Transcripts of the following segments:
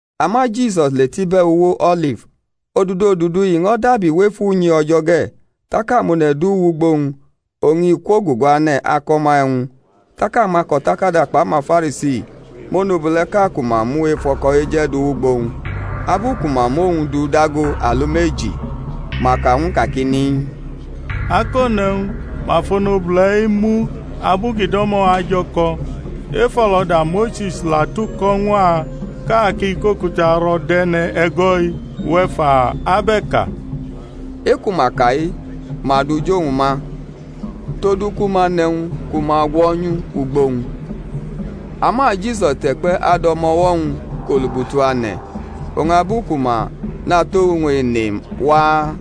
Ama Jisus le tʼibe̩ uwo O̩lif. Odudu odudu i ño̩ dabi wʼef unyi O̩jo̩ ge̩, tak amone̩ du wʼugbo-wñ, oñ i kwoguguane̩ ako̩ ma e̩wñ. Tak amako̩takada kpʼamaFarisi mʼonobule̩ʼka ku ma mu ef o̩ko̩ eje̩ du wʼugbo-wñ; abu ku ma mʼowñ du dago alumeji, ma ka ñw u kakini, Akone̩wñ, ma fʼonobule̩-i mu abu ki do̩mo̩ ajo̩ko̩. Efo̩lo̩da Mose̩s la tuko̩ ñw a ka kʼa ki kʼokuta ro̩ dʼe̩ne̩ e̩go̩-i; uwe̩ fa, ab e̩ ka? E-ku ma ka-i ma du jʼowñ ma, todu ku ma nʼe̩wñ ku ma gwo̩nyu ugbo-wñ. Ama Jisus te̩kpe̩ adʼo̩mo̩-wo̩-wñ kʼolubutu ane̩. Oñ abu ku ma natʼowñ ene waa,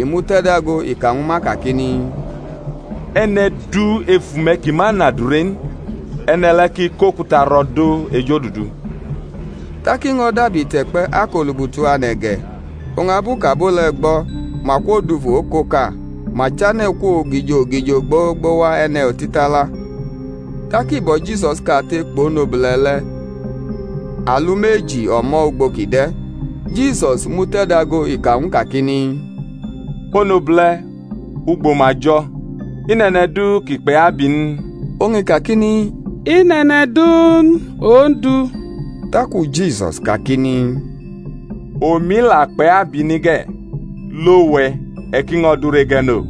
i mute̩dago, i ka ñwu ma kakini, E̩ne̩ du ef ume̩ ki ma nʼadure n, e̩ne̩ le̩ ki kʼokuta ro̩ dʼo ejodudu. Tak i ño̩ dabi te̩kpe̩ akʼolubutu ane̩ ge̩. Oñ abu kʼabo le̩ gbʼo̩, ma kwodufu okoka, ma chane̩ kwo ogijo ogijo gbogbo wa e̩ne̩ otitala; tak i bo̩ Jisus kate kpʼonobule̩ le̩ alumeji onto ugbo kʼi de̩. Jisus mute̩dago, i ka ñw u kakini, Onobule̩, ugbo ma jo̩? I nʼe̩ne̩ du ki kpʼe̩ abi n? Oñ i kakini, I nʼe̩ne̩ du n, Ondu. Taku Jisus kakini, Omi la akpʼe̩ abi ni ge̩; lo we̩, e̩ ki ño̩ dure ge̩ no.]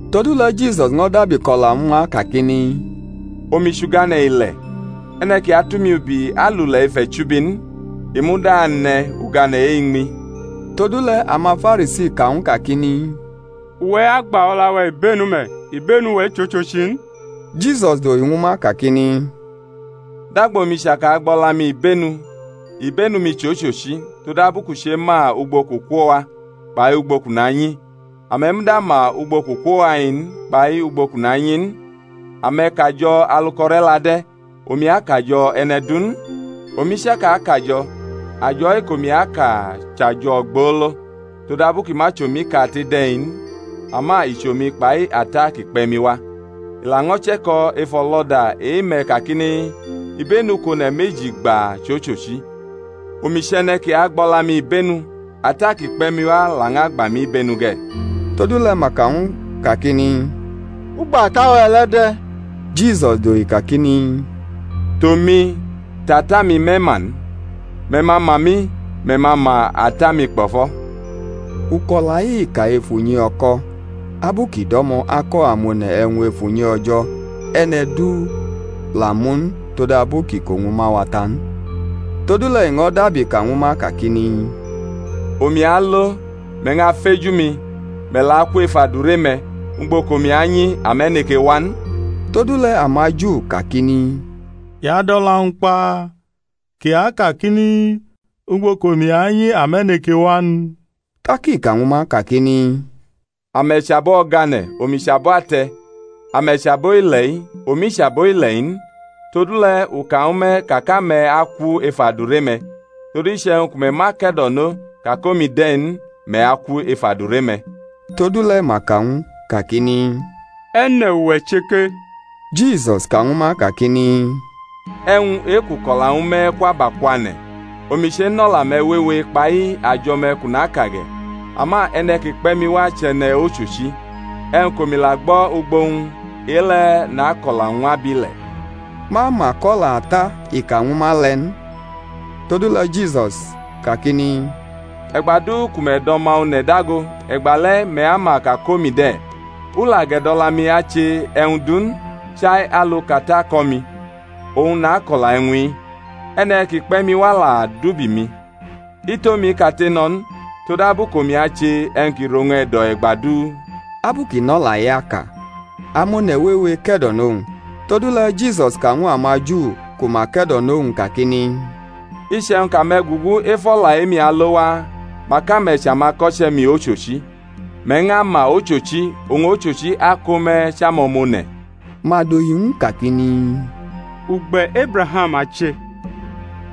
Todule̩ Jisus ño̩ dabi ko̩la ñwu ma kakini, Omi chʼugane̩ ile̩; e̩ne̩ ki atʼumi ubi alule̩ ef e̩chubi n, i muda ane̩ ugane̩ e-iñmi. Todule̩ amaFarisi ka ñw u kakini, Uwe̩ agba o̩la-we̩ ibenu me̩; ibenu-we̩ chʼochochi n. Jisus dohi ñwu ma kakini, Dagba omi chaka agba o̩la-mi ibenu, ibenu-mi chʼochochi, todabu kʼu chema ugbo kʼu kwo wa kpai ugbo kʼu nanyi; ame̩ muda ma ugbo kʼu kwo wa-i n, kpai ugbo kʼu nanyi n. Ame̩ kajo̩ alu kʼo̩re̩la de̩; omi akajo̩ e̩ne̩ du n. Omi chaka kajo̩, ajo̩ e-kʼomi aka chʼajo̩ ogbolo, todabu ki ma chʼomi kate de̩-i n, ama i chʼomi kpai Ata ki kpe̩ mi wa. I laño̩ che̩ko̩ ef o̩lo̩da e-me̩ kakini, Ibenu kʼone̩ meji gba chʼochochi. Omi chʼe̩ne̩ ki agba o̩la-mi ibenu, Ata ki kpe̩ mi wa lañʼagba mi ibenu ge̩. Todule̩ ma ka ñw u kakini, Ugbo Ata-we̩ le̩ de̩? Jisus dohi kakini, Tʼomi, tʼAta-mi me̩ ma n; me̩ ma ma mi, me̩ ma ma Ata-mi kpo̩fo̩. Uko̩la-i i ka ef unyi o̩ko̩, abu kʼi do̩mo̩ ako̩ amone̩ e̩wñ ef unyi O̩jo̩; e̩ne̩ du la mʼu n todabu kʼiko-wñ ma wa ta n. Todule̩ i ño̩ dabi ka ñwu ma kakini, Omi alo, me̩ ñʼafeju mi, me̩ la aku ef adure-me̩; ugbo kʼomi anyi, ame̩ neke wa n. Todule̩ amaJu kakini, I adʼo̩la-wñ kpa? kʼi akakini, Ugbo kʼomi anyi ame̩ neke wa n? Tak i ka ñwu ma kakini, Ame̩ chʼabo o̩gane̩, omi chʼabo ate̩; ame̩ chʼabo ile-i, omi chʼabo ile̩-i n. Todule̩ u ka ñwu me̩ ka kʼame̩ aku ef adure-me̩; todu, iche̩wñ ku me̩ ma ke̩do̩no ka kʼomi de̩ n, me̩ aku ef adure-me̩. Todule̩ ma ka ñw u kakini, E̩ne̩ uwe̩ che ke? Jisus ka ñwu ma kakini, E̩wñ e-kʼu ko̩la ñwu me̩ kwʼabakwane̩. Omi chenʼo̩la-me̩ wewe kpai ajo̩-me̩ kʼu naka ge̩; ama e̩ne̩ ki kpe̩ mi wa chʼe̩ne̩ ochochi; e̩wñ kʼomi la gbo̩ ugbo-wñ e-le̩ nako̩la ñw abile̩. Ma ma kʼo̩la Ata i ka ñwu ma le̩ n. Todule̩ Jisus kakini, E̩gba du ku me̩ dʼO̩ma One̩ dago, e̩gbale̩ me̩ ama ka kʼomi de̩; u la gʼe̩dʼo̩la-mi ache e̩wñ du n, chai alu kʼAta ko̩ mi, oñ nako̩la e̩wñ-i. E̩ne̩ ki kpe̩ mi wa la dʼubi-mi; i tʼomi kate no̩ n; todabu kʼomi ache e̩wñ ki rʼowñ e̩do̩ e̩gba du. Abu kʼi nʼo̩la-i aka, amone̩ wewe ke̩do̩nʼowñ. Todule̩ Jisus ka ñw amaJu ku ma ke̩do̩nʼowñ kakini, Iche̩wñ kʼame̩ gugu ef o̩la e-mi alo waa, mak ame̩ chʼamako̩che̩-mi ochochi; me̩ ñʼama ochochi, oñ ochochi ako me̩ chʼamo̩mone̩. Ma dohi ñw u kakini, Ugbe̩ Ebraham a che,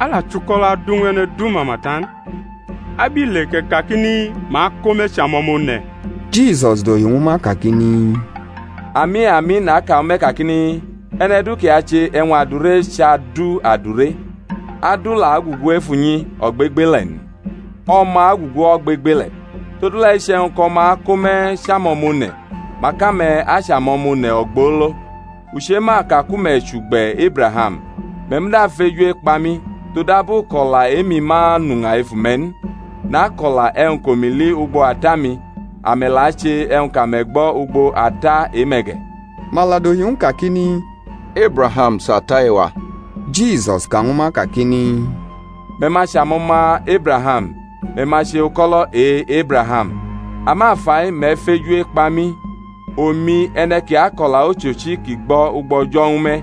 a la chʼuko̩lo̩ adu ñw e̩ne̩ du mama ta n; abile kʼe̩ kakini, Ma ako me̩ chʼamo̩mone̩? Jisus dohi ñwu ma kakini, Ami, ami, naka ñwu me̩ kakini, E̩ne̩ du ki ache e̩wñ adure chʼadu adure. Adu la agugu ef unyi ogbegbele̩ n; o̩ma agugu ogbegbele̩, Todule̩ iche̩wñ kʼO̩ma ako me̩ chʼamo̩mone̩, mak ame̩ achʼamo̩mone̩ ogbolo. U chema ka ku me̩ chʼugbe̩ Ebraham, me̩ muda feju ekpa mi, todabu kʼo̩la e-mi ma nʼuña ef ume̩ n. Nako̩la e̩wñ kʼomi li ugbo Ata-mi; ame̩ la ache e̩wñ kʼame̩ gbo̩ ugbo ata e-me̩ ge̩. Ma la dohi ñw u kakini, Ebraham chʼata e-wa. Jisus ka ñwu ma kakini, Me̩ ma chʼamo̩ma Ebraham, me̩ ma che uko̩lo̩ e̩-Ebraham. Ama fai me̩ feju ekpa mi, omi, e̩ne̩ ki ako̩la ochochi kʼi gbo̩ ugbo O̩jo̩ ñwu me̩.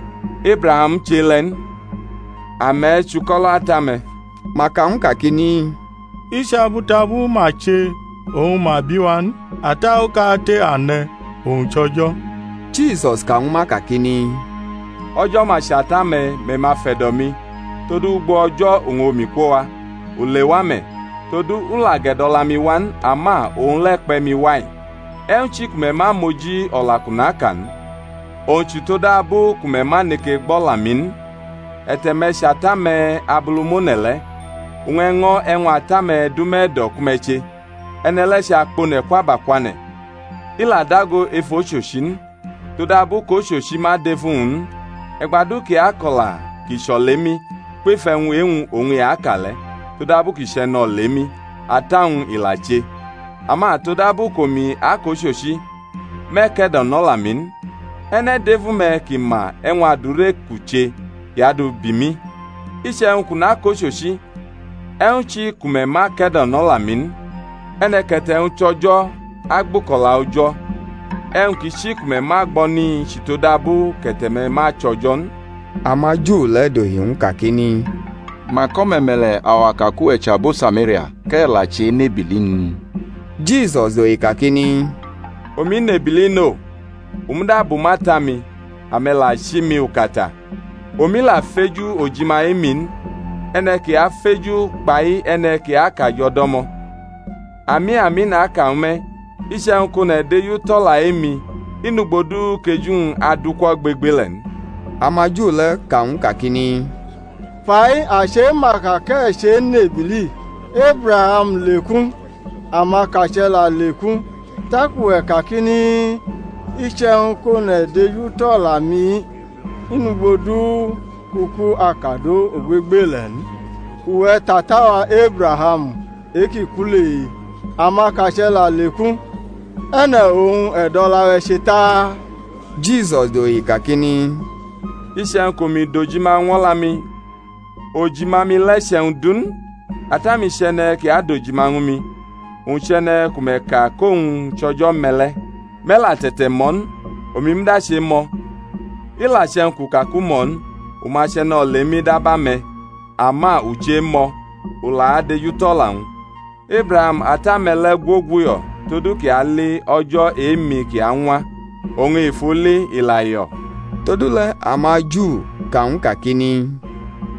Ebraham chʼe-le̩ n. Ame̩ chʼuko̩lo̩ ata-me̩. Ma ka ñw u kakini, I chʼabutabu ma che oñ ma bi wa n: ata okate a ne̩, owñ chʼO̩jo̩. Jisus ka ñwu ma kakini, O̩jo̩ ma chʼata-me̩, me̩ ma fe̩do̩ mi; todu ugbo O̩jo̩ oñ omi kwo wa, u lewa me̩; todu, u la ge̩do̩la mi wa n, ama owñ le̩ kpe̩ mi wa-i. E̩wñ chi ku me̩ ma moji o̩la kʼu naka n? owñ chʼutodabu ku me̩ ma neke gbo̩ o̩la-mi n. E̩te̩-me̩ chʼata-me̩ Abulumone̩ le̩, oñ e̩ño̩ e̩wñ ata-me̩ dʼume̩ e̩do̩ ku me̩ che. E̩ne̩ le̩ chʼakpone̩ kwʼabakwane̩, i la dago ef ochochi n, todabu kʼochochi ma dʼef uwñ n. E̩gba du kʼi ako̩la ki chʼolemi, kwef e̩wñ e-wñ oñ i aka le̩ todabu kʼi chʼe̩nolemi, ata-wñ i la che. Ama todabu kʼomi akʼochochi, me̩ ke̩do̩nʼo̩la-mi n. E̩ne̩ dʼef ume̩ ki ma e̩wñ adure kʼu che kʼi adu bi mi? Iche̩wñ kʼu nakʼochochi, e̩wñ chi ku me̩ ma kedonʼo̩la-mi n? E̩ne̩ kʼe̩te̩-wñ chʼO̩jo̩ agbʼuko̩la O̩jo̩; e̩wñ ki chi ku me̩ ma gbo̩ ni chʼutodabu kʼe̩te̩-me̩ ma chʼO̩jo̩ n. AmaJu le̩ dohi ñw u kakini, Mak o̩me̩me̩le̩ awa ka kʼuwe̩ chʼabo Samaria, kʼe̩ la chenʼebili n? Jisus dohi kakini, Omi nʼebili no, u muda bumʼAta-mi, ame̩ la chi mi ukata. Omi la feju ojima e-mi n; e̩ne̩ ki afeju kpai e̩ne̩ ki akajo̩ do̩mo̩. Ami, ami, naka ñwu me̩, iche̩wñ kʼone̩ dejutʼo̩la e-mi, i nʼugbo du kʼeju-wñ adʼuku ogbegbele̩ n. AmaJu le̩ ka ñw u kakini, Fai a chema ka kʼe̩ chenʼebili. Ebraham leku, amakache̩ la leku, tak uwe̩ kakini, Iche̩wñ kʼone̩ dejutʼo̩la-mi i nʼugbo du kʼuku akadʼo ogbegbele̩ n. Uwe̩ tʼata-wa Ebraham e-ki ku le? Amakache̩ la leku; e̩ne̩ oñ e̩ dʼo̩la-we̩ che ta? Jisus dohi kakini, Iche̩wñ kʼomi dojima ñw o̩la-mi, ojima-mi le̩ chʼe̩wñ du n; Ata-mi chʼe̩ne̩ ki adojima ñwu mi, owñ chʼe̩ne̩ ku me̩ ka kʼowñ chʼO̩jo̩-me̩ le̩; me̩ la te̩te̩mʼo̩ n, omi muda chemʼo̩; i la che̩wñ kʼu ka kʼu mʼo̩ n, u ma chʼe̩nolemi dab ame̩; ama u chemʼo̩, u la adejutʼo̩la-wñ. Ebraham ata-me̩ le̩ gwoguyo̩ todu kʼi ali o̩jo̩ e-mi ki añwa, oñ i fʼu li i la yo̩. Todule̩ amaJu ka ñw u kakini,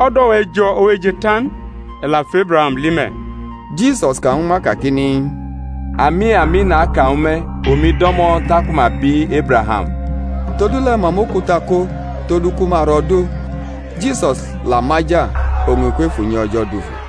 O̩do̩-we̩ jo̩ ooje ta n, e̩ la fʼEbraham li me̩? Jisus ka ñwu ma kakini, Ami, ami, naka ñwu me̩, omi do̩mo̩ taku ma bi Ebraham. Todule̩ ma mʼokuta ko todu ku ma ro̩ dʼo. Jisus la maja, oñ i kwef unyi O̩jo̩ dufu.